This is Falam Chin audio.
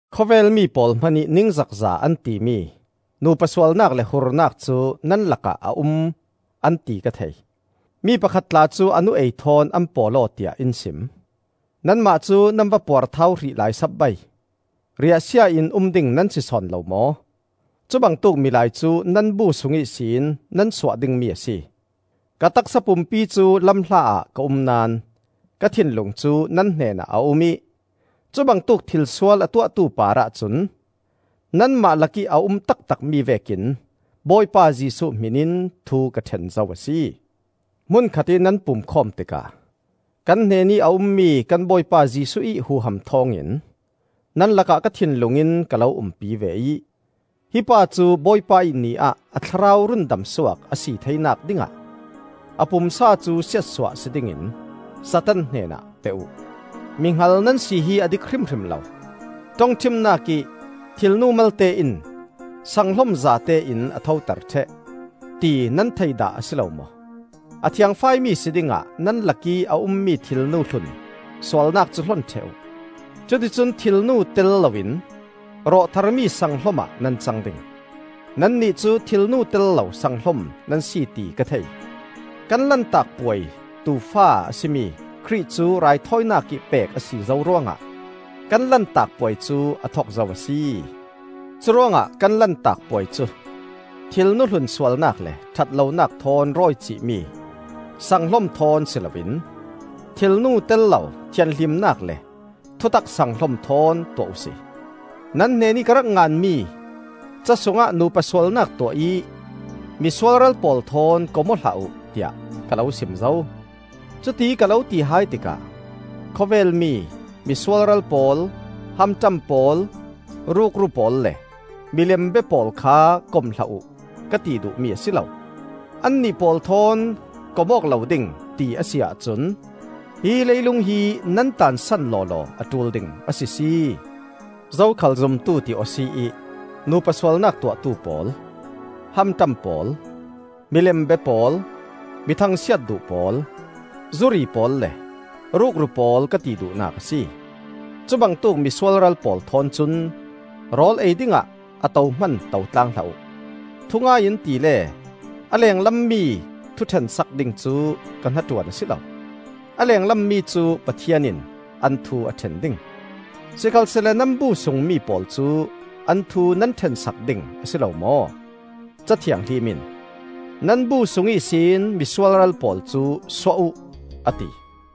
Khawvel mi pawl hmanih ningzakza an timi nupa sualnak le hurnak cu nan lakah a um an ti ka thei. Mi pakhat tla cu a nu-ei thawn an pawl-aw tiah in sim. Nanmah cu nan va puarthau hrih lai sapbai! Riahsia in um ding nan si sawn lo maw? Cubangtuk milai cu nan bu sung ihsin nan suah dingmi a si. Ka taksa pumpi cu lamhla ah ka um naón ka thinlung cu nan hnenah a um ih cubangtuk thilsual a tuahtu parah cun, nanmah lakih a um taktakmi vekin Bawipa Jesuh hmin in thu ka ṭhen zo a si. Hmun khatih nan pumkhawm tikah kan hnenih a ummi kan Bawipa Jesuh ih huham thawngin nan lakah ka thinlung in ka lo umpi ve ih, hi pa cu Bawipa ih Ni ah a thlarau rundam suak a si theinak dingah a pumsa cu siatsuah si dingin Satan hnenah pe uh. Mihngal nan si hi a dik hrimhrim lo. Ṭongṭhimnak ih, “Thilnu malte in sanghlom zate in a thoter ṭheh,” ti nan thei dah a si lo maw? A thiangfaimi si dingah nan lakih a ummi thilnu hlun sualnak cu hlon ṭheh uh. Cuticun thilnu tel loin rawh tharmi sanghlom ah nan cang ding; nannih cu thilnu tel lo sanghlom nan si ti ka thei. Kan Lantak Puai tuufa a si mi Khrih cu raithawinak ih pek a si zo ruangah kan Lantak Puai cu a thok zo a si. Curuangah kan Lantak Puai cu thilnu hlun sualnak le ṭhatlonak thawn rawicih mi sanghlom thawn si loin thilnu tel lo thianhlimnak le thutak sanghlom thawn tuah uhsi. Nan hnenih ka rak nganmi ca sungah nupa sualnak tuah ih mi sualral pawl thawn kom aw hlah uh, tiah ka lo sim zo. Cuti ka lo ti hai tikah khawvel mi: mi sualral pawl, hamṭam pawl, rukru pawl le milem bia pawl kha kom hlah uh, ka ti duhmi a si lo. Annih pawl thawn kom awk lo ding ti a si ahcun hi leilung hi nan taansan lawlaw a ṭul ding a sisi! Zokhal zumtu ti aw si ih nupa sualnak tuahtu pawl, hamṭam pawl, milem bia pawl, mi thangsiat duh pawl, zuri pawl le rukru pawl ka ti duhnak a si. Cubangtuk mi sualral pawl thawn cun rawl ei dingah a to hman to tlang hlah uh. Thungai in tile a lenglam mi thuṭhensak ding cu ka hnaṭuan a si lo. A lenglam mi cu Pathian in an thu a ṭhen ding. Sikhalsehla nan bu sungmi pawl cu an thu nan ṭhensak ding a si lo maw? Ca Thianghlim in, “Nan bu sung ihsin mi sualral pawl cu suah uh,” a ti.